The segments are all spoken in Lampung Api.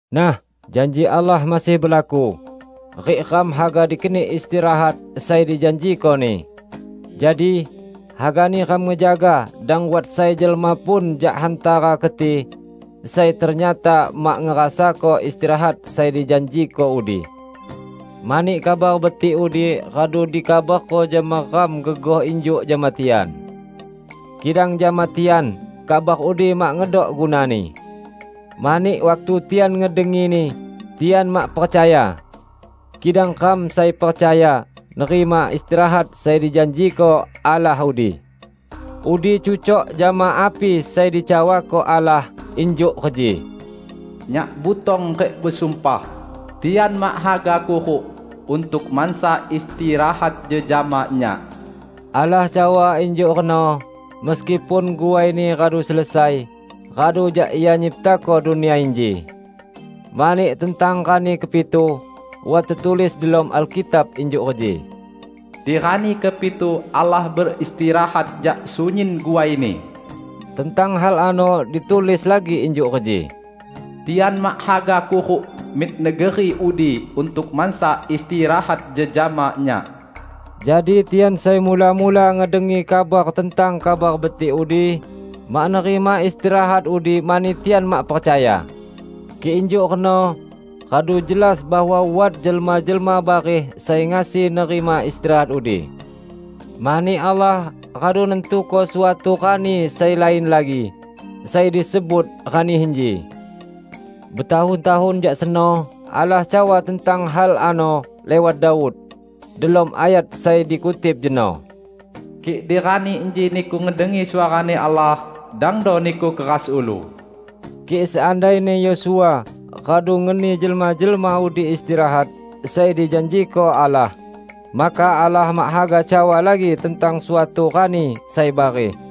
Nah, janji Allah masih belaku, rik ram haga dikeni istirahat sai dijanjiko-Ni. Jadi, hagani ram ngejaga dang wat sai jelma pun jak hantara keti sai ternyata mak ngerasako istirahat sai dijanjiko udi. Mani Kabar Betik udi radu dikabarko jama ram gegoh injuk jama tian. Kidang jama tian, kabar udi mak ngedok gunani. Mani waktu tian ngedengini, tian mak percaya. Kidang ram sai percaya nerima istirahat sai dijanjiko Allah udi. Udi cucok jama api sai dicawako Allah, injuk reji, "Nyak butong rik besumpah, 'Tian mak haga kuruk untuk mansa istirahat jejama Nyak.' " Allah cawa injuk reno meskipun guai-Ni radu selesai radu jak Ia nyiptako dunia inji. Mani tentang rani kepitu, wat tetulis delom Alkitab injuk reji, "Di rani kepitu Allah beristirahat jak sunyin guai-Ni." Tentang hal ano ditulis lagi injuk reji, "Tian mak haga kuruk mik negeri udi untuk mansa istirahat jejama Nyak." Jadi tian sai mula-mula ngedengi kabar tentang Kabar Betik udi, mak nerima istirahat udi mani tian mak percaya. Kik injuk reno radu jelas bahwa wat jelma-jelma bareh sai ngasi nerima istirahat udi. Mani Allah radu nantuko suatu rani sai lain lagi, sai disebut "Rani Inji". Betahun-tahun jak seno Allah cawa tentang hal ano liwat Daud, delom ayat sai dikutip jeno, "Kik di rani inji niku ngedengi suara-Ni Allah, dangdo niku keras ulu." Kik seandaini Yosua radu ngeni jelma-jelma udi istirahat sai dijanjiko Allah, maka Allah mak haga cawa lagi tentang suatu rani sai bareh.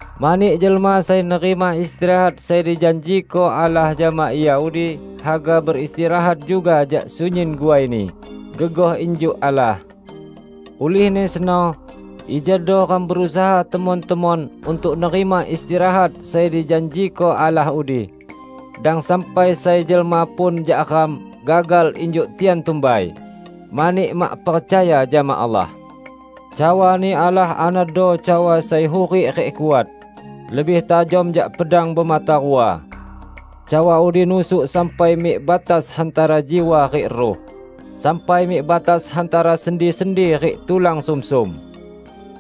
Mani jelma sai nerima istirahat sai dijanjiko Allah jama ia udi, haga beristirahat juga jak sunyin guaini, gegoh injuk Allah. Ulihni seno, ijado ram berusaha temon-temon untuk nerima istirahat sai dijanjiko Allah udi. Dang sampai sai jelma pun jak ram gagal injuk tian tumbai, mani mak percaya jama Allah. Cawa-Ni Allah anodo cawa sai hurik rik kuat; lebih tajam jak pedang bemata rua. Cawa udi nusuk sampai mik batas hantara jiwa rik ruh; sampai mik batas hantara sendi-sendi rik tulan sumsum,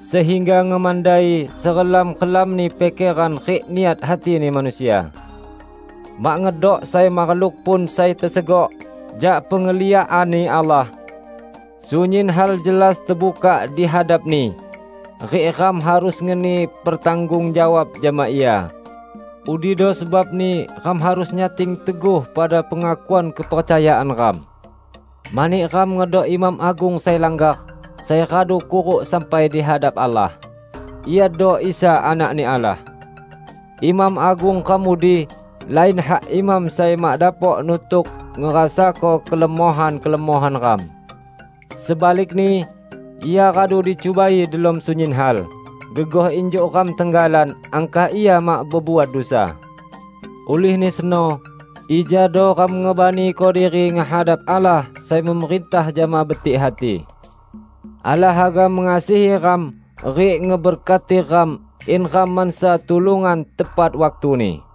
sehingga ngemandai serelam-relamni pikeran rik niat hatini manusia. Mak ngedok sai makhluk pun sai tesegok jak pengliakan-Ni Allah. Sunyin hal jelas tebukak di hadap-Ni. Rik ram harus ngeni pertanggung jawab jama Ia. Udido sebabni ram harus nyating teguh pada pengakuan kepercayaan ram. Mani ram ngedok Imam Agung sai langgar, sai radu kuruk sampai di hadap Allah -- Iado Isa Anak-Ni Allah. Imam Agung ram udi lain hak imam sai mak dapok nutuk ngerasako kelemohan-kelemohan ram. Sebalikni, Ia radu dicubai delom sunyin hal, gegoh injuk ram tenggalan; angkah Ia mak bebuat dusa! Ulihni seno, ijado ram ngebaniko diri ngehadap Allah sai memerintah jama betik hati. Allah haga mengasihi ram rik ngeberkati ram in ram mansa tulungan tepat waktuni.